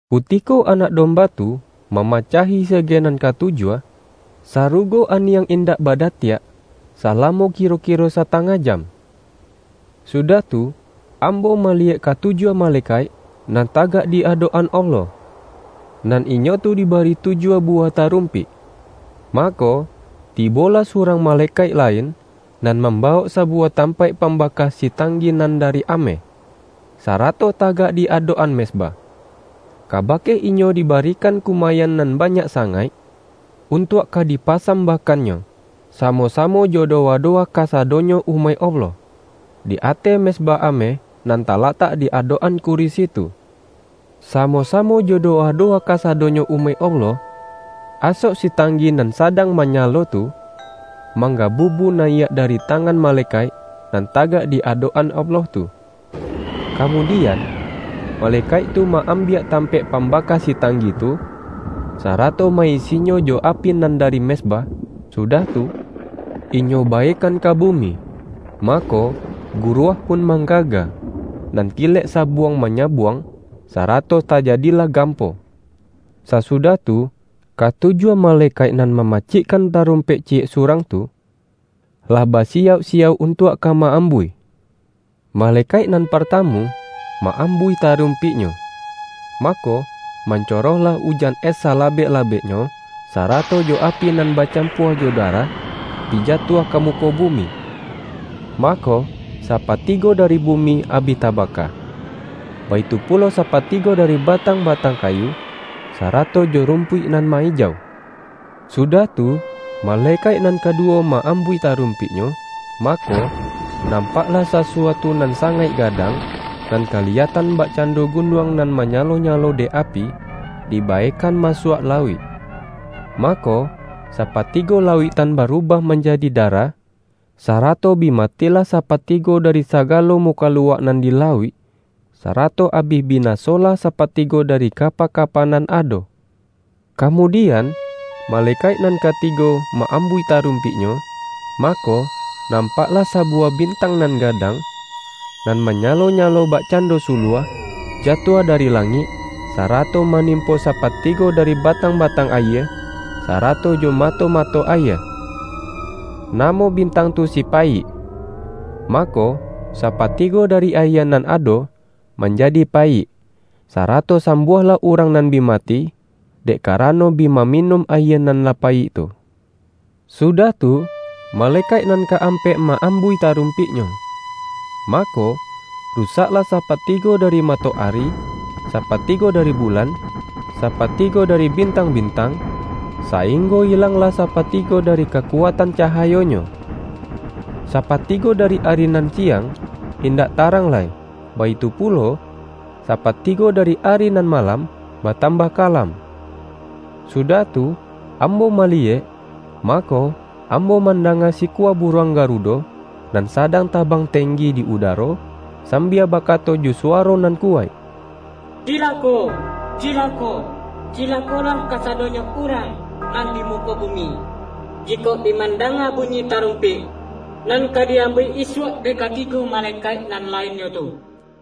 Kutiko Anak Domba tu mamacahi sege nan katujuah, sarugo aniang indak badatiak salamo kiro-kiro satangah jam. Sudah tu, ambo maliyek katujuah malekaik nan tagak di adok-an Allah, nan inyo tu dibari tujuah buwah tarumpik. Mako, tibolah surang malekaik la-in, nan mambawok sabuwah tampaik pambaka sitanggi nan dari ameh, sa-rato tagak di adok-an mezbah. Ka-bake inyo dibarikan kumayan nan banyak sangaik, untuak ka dipasam-bahkannyo, samo-samo jo dowa-do-wa kasadonyo umaik Allah, di ateh mezbah ameh nan talatak di adok-an kurisi tu. Samo-samo jo dowa-dowa kasadonyo umaik Allah, asok sitanggi nan sadang manyalo tu, manggabubu nayiak dari tangan malekaik nan ta-gak di adok-an Allah tu. Kamudian, malekaik tu ma-ambiak tampaik pam-baka sitanggi tu, sarato ma-isinyo jo api nan dari mezbah, sudah tu, inyo baekan ka bumi. Mako, guruah pun manggaga, nan kilek sabuang-manya-buang, sarato tajadilah gampo. Sasudah tu, katujuah malekaik nan mamacikkan tarumpik ciyek su-rang tu, lah basiyauk-siyauk untuak ka ma-ambuih. Malekaik nan partamu, ma-am-buih tarumpiknyo, mako, mancoroh-lah ujan es salabek-labeknyo, sarato jo api nan bacampua jo darah, bi ja-tuah ka muko bumi. Mako, sapatigo dari bumi abih tabaka; baitu pulo sa-patigo dari batang-batang kayu, sara-to jo rumpuik nan ma-ijau. Sudah tu, malekaik nan kaduwo ma-ambuih tarumpiknyo, mako, nam-paklah sasuatu nan sangaik gadang, nan kaliyatan bakcando gunuang nan manyalo-nyalo dek api, dibae-kan masuak lauik. Mako, sapatigo la-uiktan barubah manjadi darah, sarato bi matilah sapatigo dari sagalo mukaluak nan di lauik; sarato abih binasolah sapatigo dari kapa-kapa nan ado. Kamudian, malekaik nan kati-go ma-ambuih tarumpiknyo, mako, nampaklah sabuwah bintang nan ga-dang, nan manyalo-nyalo bakcan-do suluah, jatuah dari langik, sarato manimpo sapatigo dari batang-ba-tang ayie, sarato jo mato-mato ayie. (Namo bintang tu si”Payik”.) Ma-ko, sapatigo dari ayie nan ado, man-jadi payik, sarato sambuahlah urang nan bi mati, dek karano bi maminun ayie nan lah payik tu. Sudah tu, malekaik nan ka-am-pek ma-ambuih tarumpiknyo. Mako, rusaklah sapatigo dari matoari, sapa-tigo dari bulan, sapatigo dari bintang-bintang, sainggo ilanglah sapatigo da-ri kakuatan cahayonyo. Sapatigo dari ari nan siang, indak tarang lai, baitu pulo, sapatigo dari ari nan malam, ba-tambah kalam. Sudah tu, ambo maliyek, mako, ambo mandanga sikua buruang ga-rudo, nan sadang tabang tenggi di udaro, sambia bakato jo suwaro nan kuwaik,”Cilako! Cilako! Cilakolah kasadonyo urang nan di muko bu-mi, jikok bi mandanga bunyi tarum-pik, nan ka di-ambuih isuak dek kati-go malekaik nan lainnyo tu!”